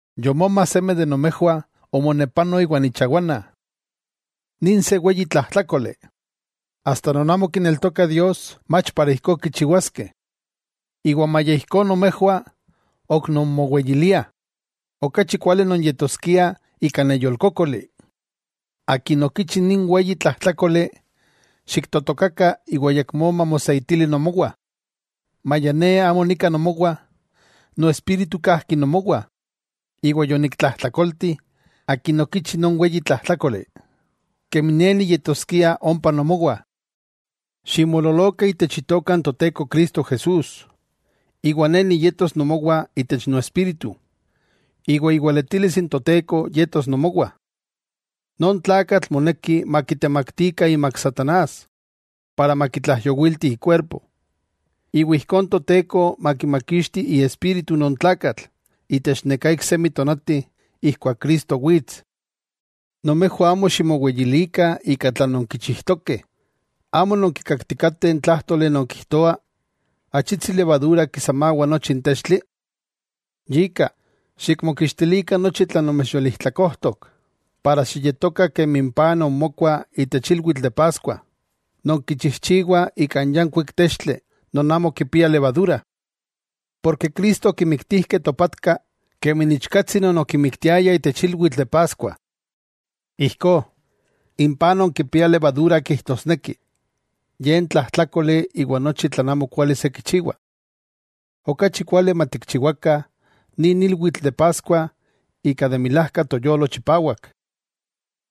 Yomoma seme de nomejwah omonepano iwan ichawana. Nin se weyi tlajtlákoli, asta non amo kineltokah Dios mach para ijkó kichiwaskeh. ¡Iwa maya ijkó nomejwah ok nonmoweyiliah! ¡Okachi kuali nonyetoskiah ika neyolkókoli! Akin okichi nin weyi tlajtlákoli xiktotokakah iwa ayakmó mamoseitili nomowah. Maya ne amo nika nomowah, noespíritu kajki nomowah, iwa yoniktlajtlakolti akin okichi non weyi tlajtlákoli, kemi ne niyetoskia ompa nomowah. Ximoololokah itech Itoka n Toteko Cristo Jesús, iwa ne niyetos nomowah itech noespíritu. Iwa iweletilis n Toteko yetos nomowah. Non tlakatl moneki makitemaktikah imak satanás para makitlaijyowilti ikuerpo, iwa ijkó n Toteko makimakixti iespíritu non tlakatl itech neká iksemi tonati ijkuak Cristo wits. Nomejwah amo ximoweyilikah ika tlan nonkichijtokeh. ¿Ayamó nonkikakih n tlájtoli non kijtoa: “Achitsi levadura kisamawa nochi n textli”? Yika, xikmokixtilikah nochi tlan nomechyolijtlakojtok, para xiyetokah kemi n paj non mokua itech ilwitl de paskuah, non kichijchiwah ika n yankuik textli non amo kipia levadura, porke Cristo okimiktijkeh topatka kemi n ichkatsi non okimiktiayah itech ilwitl de Paskua. Ijkó, n paj non kipia levadura kijtosneki ye n tlajtlákoli iwa nochi tlan amokuali se kichiwa. Okachi kuali matikchiwakah nin ilwitl de Paskua ika de milajka toyolo chipawak,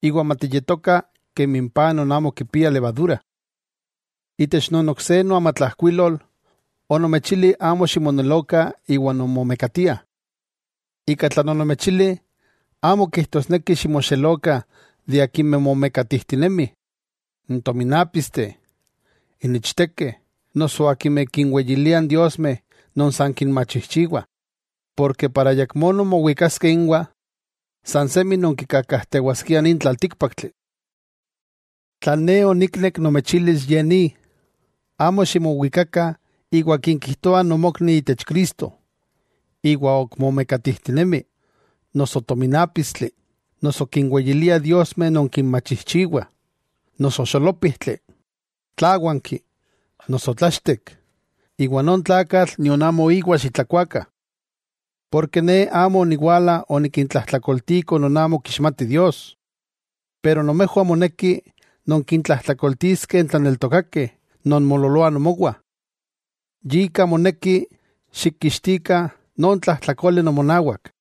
iwa matiyetokah kemi n paj non amo kipia levadura. Itech non ok se noamatlajkuilol onomechili amo ximonelokah iwa non momekatiah. Ika tlan onomechili amo kijtosneki ximoxelokah de akimeh momekatijtinemih, n tominápisteh, n ichtekeh, noso akimeh kinweyiliah n diosmeh non san kinmachijchiwah, porke para ayakmó nonmowikaskeh inwah, san semi nonkikakajtewaskiah nin tlaltíkpaktli. Tlan ne oniknek nomechilis ye ni: Amo ximowikakah iwa akin kijtoa nomokni itech Cristo, iwa ok momekatijtinemi, noso tominápistli, noso kinweyilia diosmeh non kinmachijchiwah, noso xolópijtli, tláwanki, noso tlachtek, iwa non tlakatl nion amo íwa xitlakuakah. Porke ne amo oniwala onikintlajtlakoltiko non amo kixmatih Dios. Pero nomejwah moneki nonkintlajtlakoltiskeh n tlaneltokakeh non moololoah nomowah. Yika moneki xikkixtikah non tlajtlakole nomonawak.